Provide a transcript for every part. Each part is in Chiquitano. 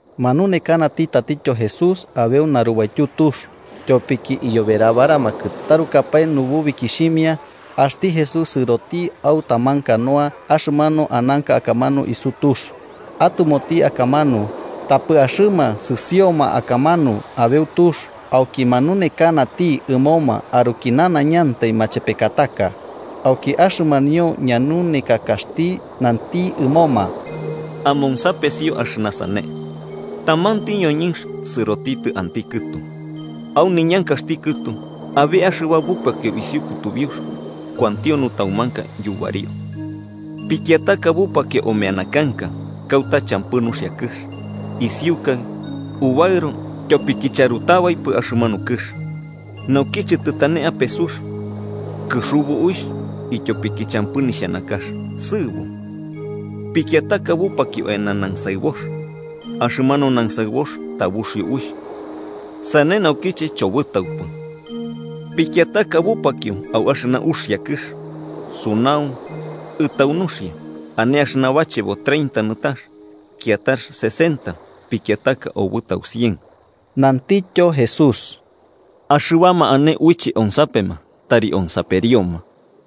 Manunekanati tatityo Jesús abeu narubaityu tux. Tyopiki iyoberabaramakɨ tarukapae nububikixhimia, axti Jesús sɨroti au taman canoa axɨmanu ananka akamanu isu tux, atɨmoti akamanu, tapɨ axɨma sɨsioma akamanu abeu tux. Auki manunekanati ɨmoma aruki nanaiñantai machepekataka. Auki axɨmanio ñanunekakaxti nanti ɨmoma: “Amonsapesio axɨna sane: Tamanti ñoñɨnx sɨrotitɨ anti kɨtu. Au niñankaxti kɨtu, abe axɨba bupakio isiu kutubiux, kuantio nutaumanka yubario. Pikiataka bupakio omeana kanka, kauta champɨ nuxia kɨx. Isiukai ubaɨro tyopiki charutabaipɨ axɨmanu kɨx. Naukiche tɨtane ape sux, kɨxubu uixh, ityopiki champɨ nixhanakax, sɨɨbo. Pikiataka bupakio eana nansaɨbox, axɨmanu nansaɨbox tabuxio uixh, sane naukiche chobɨtaupɨ. Pikiataka bupakio au axɨna uxia kɨx, sunau, ɨtau nuxia. Ane axɨna bachebo treinta nɨtax, kiatax sesenta, pikiataka obɨtau cien.” Nantityo Jesús: “Axɨbama ane uiche onsapema, tari onsaperioma.”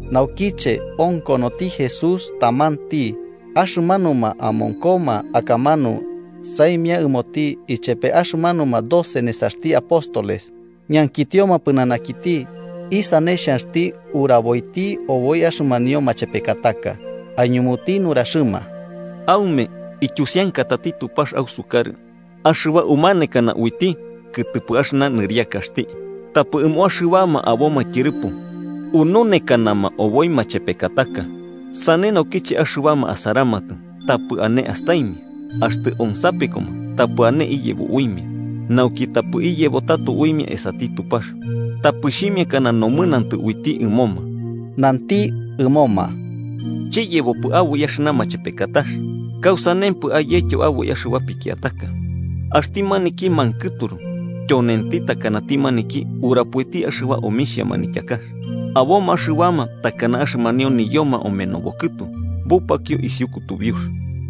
Naukiche, onkonoti Jesús tamanti, axɨmanuma amonkoma akamanu saimia ɨmoti ichepe axɨmanuma doce nesaxti apóstoles ñankitioma pɨnanakiti isane xhanxti uraboiti oboi axɨmanio machepekataka. Aiñumuti nuraxɨma: “Aume, ityusiankatati Tupax ausukarɨ axɨba umanekana uiti kɨtɨpɨ axɨna nɨriakaxti. Tapɨ ɨmo axɨbama aboma tyɨrɨpo ununekanama oboi machepekataka, sane nauki axɨbama asaramatɨ, tapɨ ane astaimia, axtɨ onsapekoma, tapɨ ane iyebo uimia, nauki tapɨ iyebo tato uimia esati Tupax, tapɨ xhimiakana nomɨnantɨ uiti ɨmoma.” Nanti ɨmoma: “¿Chiyebopɨ aboi axɨna machepekatax? ¿Kausanempɨ ayetyo aboi axɨba pikiataka? Axti maniki mankɨturu tyonenti takanati maniki urapoiti axɨba omixhia manityakax. Aboma axɨbama takana axɨmanio niyoma omenobo kɨtu bupakio isiu kutubiux: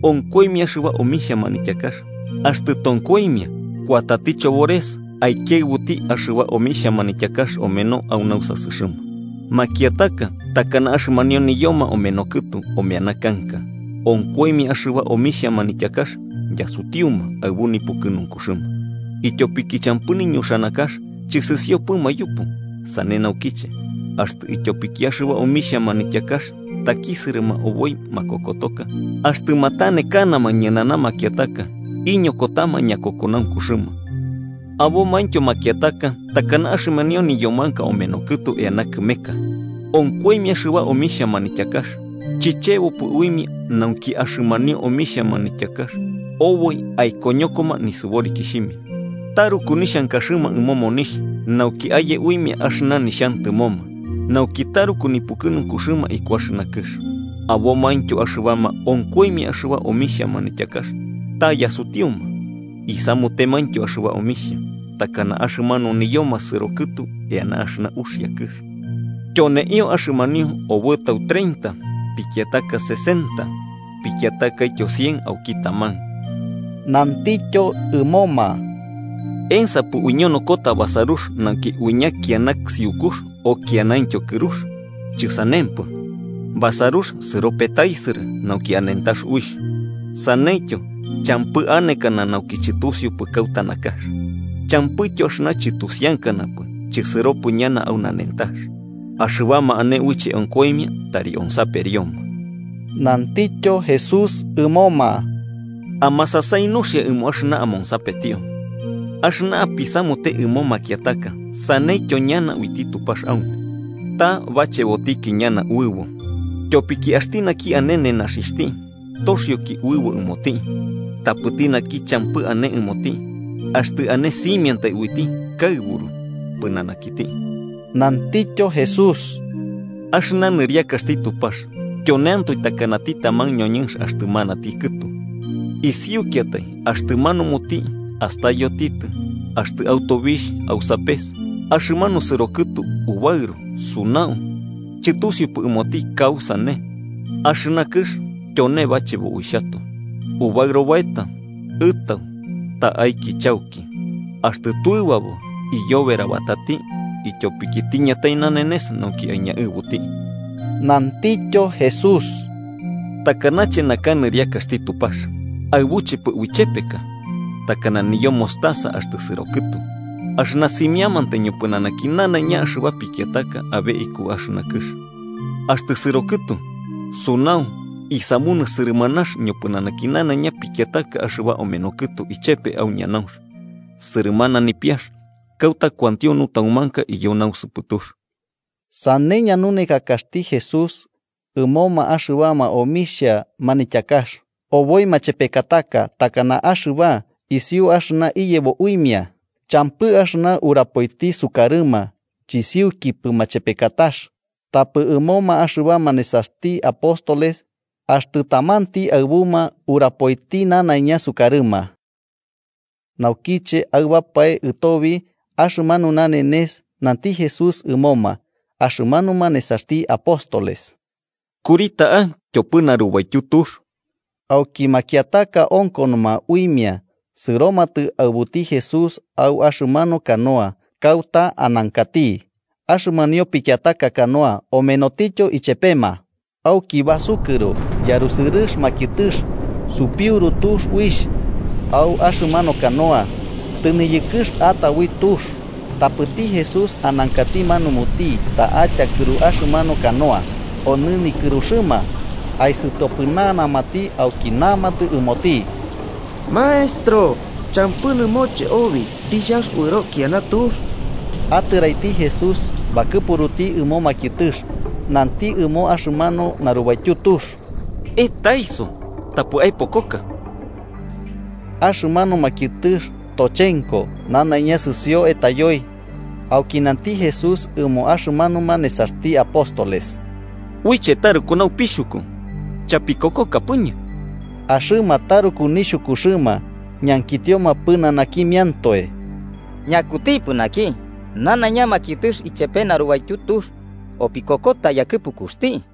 onkoimia axɨba omixhia manityakax, axtɨ tonkoimia kuatati Chobores aikiaɨbuti axɨba omixhia manityakax omeno au nausasɨxɨma. Makiataka takana axɨmanio niyoma omeno kɨtu omeana kanka: onkoimia axɨba omixhia manityakax yasutiuma aɨbu nipukɨnunkuxɨma, ityopiki champɨ niñuxanakax, chɨsɨsiopɨma yupu. Sane naukiche, axtɨ ityopiki axɨba omixhia manityakax takisɨrɨma oboi makokotoka, axtɨ matanekanama ñɨnana makiataka, iñokotama ñakokonaunkuxɨma. Abomaintyo makiataka takana axɨmanio niyomanka omeno kɨtu eana kɨmeka: onkoimia axɨba omixhia manityakax, chɨchebopɨ uimia nauki axɨmanio omixhia manityakax oboi aikoñokoma nisɨborikixhimia. Taruku nixhankaxɨma ɨmo monixh nauki aye uimia axɨna nixhantɨmoma, nauki taruku nipukɨnunkuxɨma iku axɨna kɨx. Abomaintyo axɨbama onkoimia axɨba omixhia manityakax ta yasutiuma, isamutemaintyo axɨba omixhia, takana axɨmanu niyoma sɨro kɨtu eana axɨna uxia kɨx. Tyoneio, axɨmanio obɨtau treinta, pikiataka sesenta, pikiatakaityo cien auki taman.” Nantityo ɨmoma: “¿Ensapɨ uiñonokota basarux nauki uiña kiana siukux o ikianaintyo kɨrux? Chɨsanempɨ, basarux sɨro petaisɨrɨ, nauki anentax uixh. Saneityo, champɨ anekana nauki chɨtusiupɨ kauta nakax, champɨityo axɨna chɨtusiankanapɨ chisɨropɨ ñana au nanentax. Axɨbama ane uiche onkoimia, tari onsaperioma.” Nantityo Jesús ɨmoma: “Amasasai nuxia ɨmo axɨna amonsapetio. Axɨna apisamute ɨmo makiataka saneityo ñana uiti Tupax aume. Ta bachebotiki ñana uɨbo. Tyopiki axti naki ane nenaxixhti, toxioki uɨbo ɨmoti. Tapɨti naki champɨ ane ɨmoti, axtɨ ane simiantai uiti kaɨburu pɨnanakiti.” Nantityo Jesús: “Axɨna nɨriakaxti Tupax tyoneantoe takanati taman ñoñɨnx axtɨ manati kɨtu: isiukiatai axtɨ manumuti astayotitɨ, axtɨ au tobixh au sapes, axɨmanu sɨrokɨtu ubaɨro sunau, chɨtusiupɨ ɨmoti kausane. Axɨna kɨx tyone bachebo uixhatoe: ubaɨro baeta, ɨtau, ta'aiki chauki. Axtɨ tuɨbabo, iyoberabatati, ityopiki tiñatai nanenes nauki aiñaɨbuti.” Nantityo Jesús: “¿Takanache naka nɨriakaxti Tupax, aɨbuchepɨ uichepeka? Takana niyo mostaza axtɨ sɨro kɨtu. Axɨna simiamantai ñopɨnanaki nanaiña axɨba pikiataka abe ikuki axɨna kɨx, axtɨ sɨro kɨtu, sunau isamunɨ sɨrɨmanax ñopɨnanaki nanaiña pikiataka axɨba omeno kɨtu ichepe au ñanaunx, sɨrɨmana nipiax kauta kuantio nutaumanka iyo nausɨpɨtux.” Sane ñanunekakaxti Jesús ɨmoma axɨba omixhia manityakax, oboi machepekataka takana axɨba, isiu axɨna iyebo uimia. Champɨ axɨna urapoiti sukarɨma chisiukipɨ machepekatax, tapɨ ɨmoma axɨbama nesaxti apóstoles axtɨ tamanti aɨbuma urapoiti nanaiña sukarɨma. Naukiche aɨbapae ɨtobi axɨmanu nanenes, nanti Jesús ɨmoma axɨmanuma nesaxti apóstoles: –Kuri ta'a tyopɨ narubaityu tux. Auki makiataka onkonoma uimia sɨromatɨ aɨbuti Jesús au axɨmanu canoa kauta anankati. Axɨmanio pikiataka canoa omenotityo ichepema. Auki basukɨro yarusɨrɨx makiɨtɨx, supiuru tux uixh au axɨmanu canoa, tɨniyɨkɨx ata ui tux. Tapɨti Jesús anankati manumuti ta'a tyakɨru axɨmanu canoa, onɨ nikɨruxɨma. Aisɨtopɨnanamati auki namatɨ ɨmoti: –¡Maestro! ¿Champɨ nɨmoche obi tixhanx uɨro kiana tux? Atɨraiti Jesús bakɨpuruti ɨmo makiɨtɨx, nanti ɨmo axɨmanu narubaityu tux: –¡Etaiso! ¡Tapɨ aepokoka! Axɨmanu makiɨtɨx tochenko, nanaiña sɨsio etayoi. Auki nanti Jesús ɨmo axɨmanuma nesaxti apóstoles: –¿Uiche taruku naupixhuku? ¿Chapikokokapɨñɨ? Axɨma taruku nixhukuxɨma, ñankitioma pɨnanakimiantoe: –¿Ñakutipɨ naki, nanaiña makiɨtɨx ichepe narubaityu tux opikokota yakɨpukuxti?